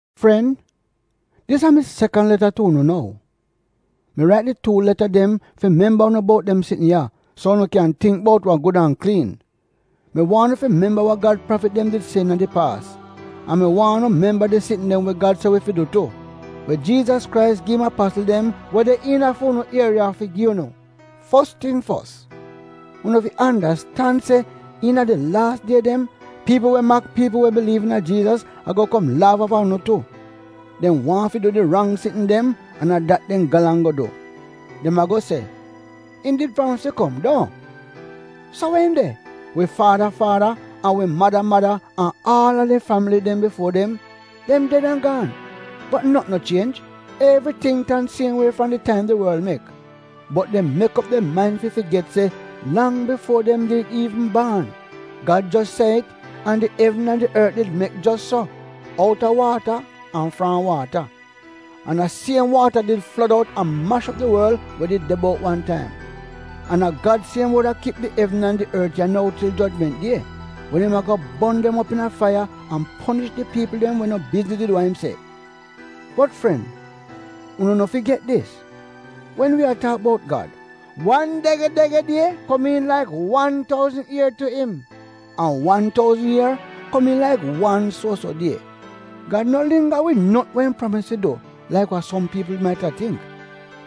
Fren, dis a mi sekan leta tu unu nou. Mi rait di tuu leta dem fi memba unu bout dem sitn ya, so unu kyan tingk bout wa gud an kliin. Mi waahn unu fi memba we Gad prafit dem did se iina di paas. An mi waahn unu memba di sitn dem we Gad se wi fi du tu, we Jiizas Krais gi im apasl dem we de iina fi unu komyuuniti fi gi unu. Fos ting fos, unu fi andastan se iina di laas die dem, piipl we mak piipl we biliiv iina Jiizas, ago kom laaf aafa unu tu. Dem waahn fi du di rang sitn dem an a dat dem galang go du! Dem ago se, “Im did pramis fi kom, duohn? So we im de? Wi faada faada an wi mada mada an aal a di fambili bifuo dem, dem ded an gaan, bot notn no chienj, evriting tan siem wie fram di taim di worl mek!” Bot dem mek op dem main fi figet se, lang bifuo dem did iivn baan Gad jos se it an di evn an di ort did mek jos so — outa waata an fram waata. An a siem waata did flod out an mash op di worl we did de bout wan taim. An a Gad siem wod a kip di evn an di ort ya nou til jojment die wen im ago bon dem op iina faiya an ponish di piipl dem we no bizniz wid wa im se. Bot fren, unu no figet dis: Wen wi a taak bout Gad — wan dege-dege die komiin laik aal wan touzn ier tu im; an wan touzn ier komiin laik wan suo-so die. Gad no lingga wid notn we im pramis fi du laik wa som piipl maita tingk.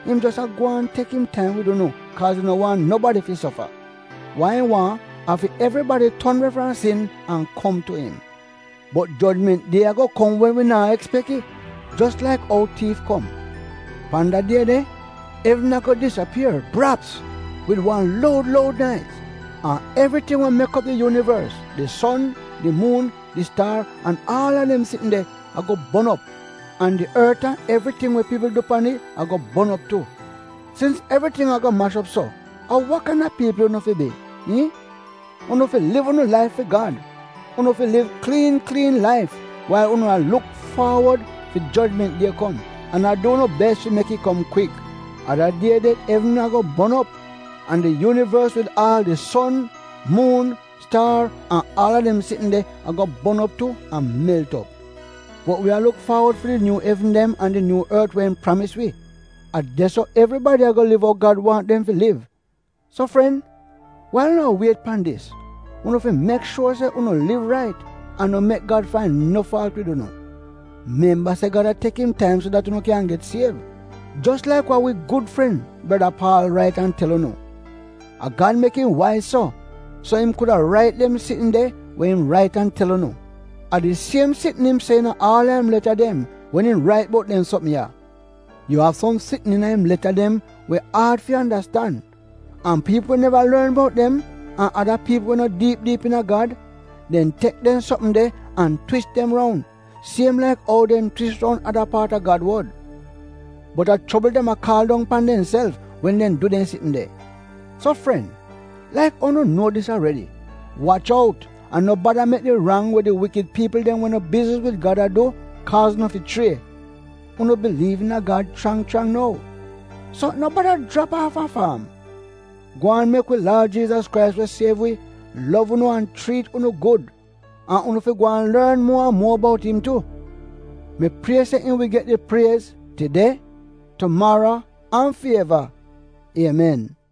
Im jos a gwaan tek im taim wid unu kaaz im no waahn nobadi fi sofa. Wa im waahn a fi evribadi ton we fram sin an kom tu im. Bot jojment die ago kom wen wi naa ekspek it — jos laik ou tiif kom. Pan da die de, evn ago disapier — braps — wid wan loud loud naiz. An evriting we mek op di yuunivors, di son, di muun, di staar an aal a dem sitn de ago bon op, an di ort an evriting we piipl du pan it ago bon op tu. Sins evriting ago mash op so, a wa kaina piipl unu fi bi, iihn? Unu fi liv unu laif fi Gad. Unu fi liv kliin kliin laif wail unu a luk faawod fi jojment die kom an a du unu bes fi mek it kom kwik. A da die de evn ago bon op, an di yuunivors wid aal di son, muun, staar an aal a dem sitn de ago bon op tu an melt op. Bot wi a luk faawod fi di nyuu evn dem an di nyuu ort we im pramis wi. A de-so evribadi ago liv ou Gad waahn dem fi liv. So fren, wail unu a wiet pan dis, unu fi mek shuor se unu liv rait, an no mek Gad fain no faalt wid unu. Memba se Gad a tek im taim so dat unu kyan get siev, jos laik wa wi gud fren, breda Paal rait an tel unu. A Gad mek im waiz so, so im kuda rait dem sitn de we im rait an tel unu. A di siem sitn im se iina aal a im leta dem, wen im rait bout dem sopm ya. Yu av som sitn iina im leta dem we aad fi andastan, an piipl we neva lorn bout dem an ada piipl we no diip diip iina Gad, dem tek dem sopm de an twis dem roun, siem laik ou dem twis roun ada paat a Gad wod. Bot a chobl dem a kaal dong pan demself wen dem du dem sitn de. So fren, laik ou unu nuo dis aredi, wach out an no bada mek di rang we di wikid piipl dem we no bizniz wid Gad a du, kaaz unu fi chrie. Unu biliiv iina Gad chrang chrang nou, so no bada jrap aafa faam. Gwaan mek wi Laad Jiizas Krais we siev wi, lov unu an chriit unu gud, an unu fi gwaan lorn muo an muo bout im tu. Mi prie se im wi get di priez, tide, tumaro an fi eva! Iemen.